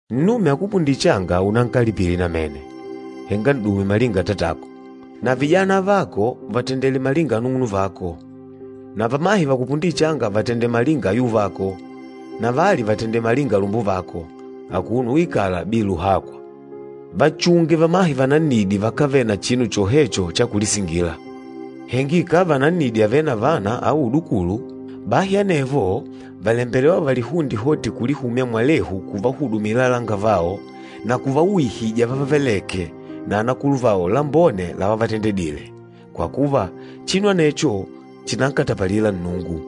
Nnume akupundîle changa unankalipile namene, henga n'dume malinga atatako. Na vijana avako vatendele malinga anung'unuvako, na vamahe vakupundîle changa vatendele malinga ayuvako, na vali vatendele malinga alumbuvako, akuno uikala bila uhakwa. Vachunge vamahe vanannidi vakávele na chinu chohecho cha kulisingila. Henga ikàva nannidi àvele na vana au udukulu, bahi anevo vàlembelewa valihunde hoti kulihumya mwalehu kuvahudumila alangavao na kuvauhija vávavelèkè na anakuluvao lambone lavavatendedile, kwa kuva, chinu anecho chìnankatapalila Nnungu.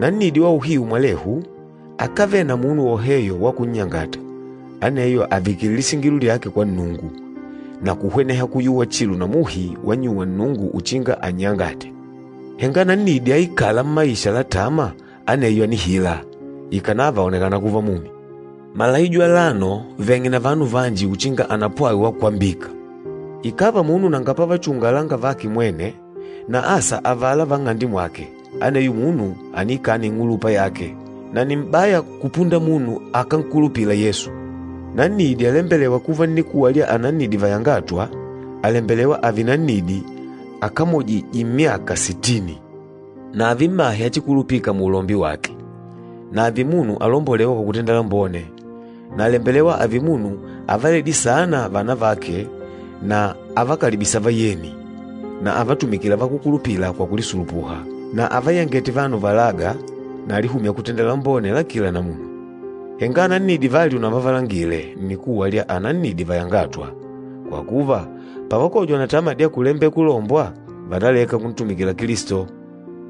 Nannidi wa uhiu mwalehu, akávele na munu woheyo wa kunnyangata, aneyo àvikile lisingilo lyake kwa Nnungu, na kuhweneha kuyuwa chilo na muhi wannyuwa Nnungu uchinga annyangate. Henga nannidi aikâla mmaisha la tama, aneyo ànihila, ikànava àonekana kuva mumi. Malaijo alano veng'e na vanu vanji uchinga anapwawe wa kwambika. Ikàva munu nanga pavachunga alangavake mwene, na asa avala va nng'ande mwake, aneyo munu àniikana ing'ulupa yake, na nni m'baya kupunda munu akánkulupila Yesu. Nannidi alembelêwa kuva nnikuwa lya anannidi vayangâtwa, àlembelewa ààve nannidi akamojîje myaka sitini. Na ààve mmahe achikulupika muulombi wake, na ààve munu alombolêwa kwa kutenda lambone. Na àlembelewa ààve munu avaledîle saana vana vake na avakalibîsa vayeni na avatumikîla vakúkulupila kwa kulisulupuha, na avayangête vanu valâga na alihûmya kutenda lambone la kila namuna. Henga anannidi vali unavavalangile nnikuwa lya anannidi vayangâtwa, kwa kuva, pavakojwa na tama dya kulembela kulombwa, vànaleka kuntumikila Kilisto.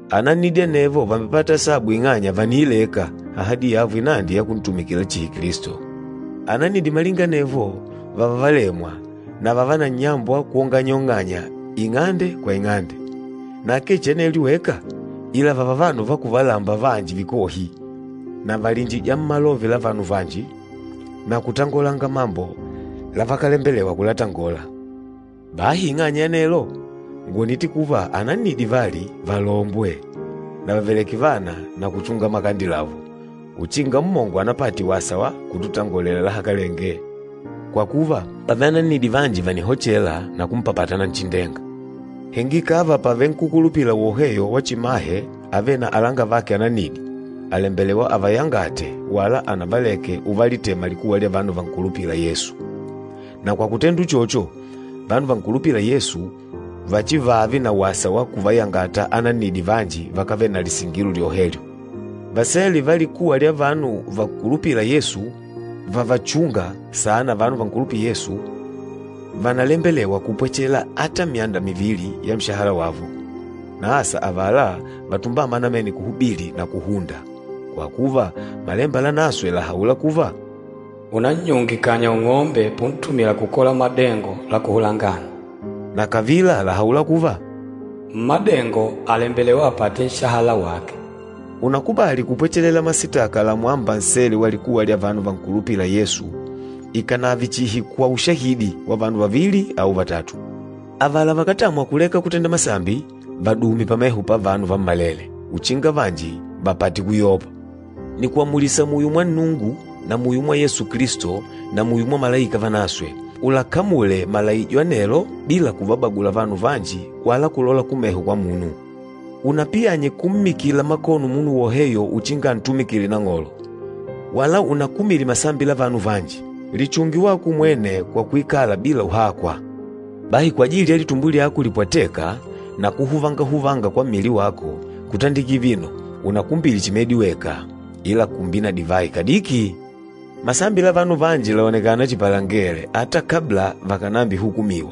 Anannidi anevo vàmbepata asabu ing'anya vàniileka ahadi yavo inandi ya kuntumikila chihi Kilisto. Anannidi malinga anevo, vààva valemwa na vààva na nnyambo wa kwonganyaonganya ing'ande kwa ing'ande. Na akee chihi anelyo weka, ila vààva vanu va kuvalamba vanji vikohi, na vàliinjija mmalove la vanu vanji, na kutangolanga mambo lavakalembelewa kulatangola. Bahi ing'anya ya anelo, ngwònite kuva anannidi vali, valombwe, na vàveleke vana na kuchunga makande lavo, uchinga mmongo anapate wasa wa kututongolela lahakalenge. Kwa kuva, pàvele anannidi vanji vànihochela na kumpapata Nanchindenga. Henga ikàva pàvele nkúkulupila woheyo wa chimahe avêle na alangavake anannidi, àlembelewa avayangate wala anavaleke uvalitema likuwa lya vanu vankulupîla Yesu. Na kwa kutenda uchocho, vanu vankulupîla Yesu vachivaave na wasa wa kuvayangata anannidi vanji vakávele na lisingilo lyohevyo. Vasele va likuwa lya vanu vankulupîla Yesu vavachûnga saana vanu vankulupîla Yesu, vànalembelewa kupwechela ata myanda mivili ya nshahala wavo, na asa avala vatumbâma namene kuhubili na kuhunda. Kwa kuva, Malemba Lanaswe làhaula kuva, “Unannyunge kanya ung'ombe puntumila kukola madengo la kuhula ngano,” na kavila làhaula kuva, “Mmádengo àlembelewa apate nshahala wake.” Unakubàlì kupwechelela masitaka lamwâmba nsele wa likuwa lya vanu vankulupîla Yesu ikànave chihi kwa ushahidi wa vanu vavili au vatatu. Avala vakátamwa kuleka kutenda masambi, vadume pameho pavanu vammalele, uchinga vanji vapate kuyopa. Nìkuamulisa muyo mwa Nnungu na muyo mwa Yesu Kilisto na muyo mwa malaika vanaswe, ulakamule malaijo anelo bila kuvabagula vanu vanji wala kulola kumeho kwa munu. Unapiyanye kummikila makono munu woheyo uchinga antumikile Nang'olo, wala unakumile masambi la vanu vanji. Lichunge wako umwene kwa kuikala bila uhakwa. Bahi kwajili ya litumbo lyako lipwatêka na kuhuvangahuvanga kwa mmili wako, kutandikila vino unakumbile chihi medi weka, ila kumbila na divayi kadiki. Masambi la vanu vanji làonekana chihi palengele ata kabla vakànambihukumiwa.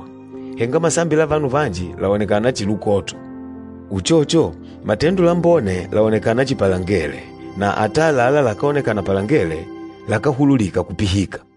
Henga masambi la vanu vanji làonekana chihi lukoto. Uchocho, matendo lambone làonekana chihi palengele na ata àlalá lakáonekana palengele, lakáhululika kupihika.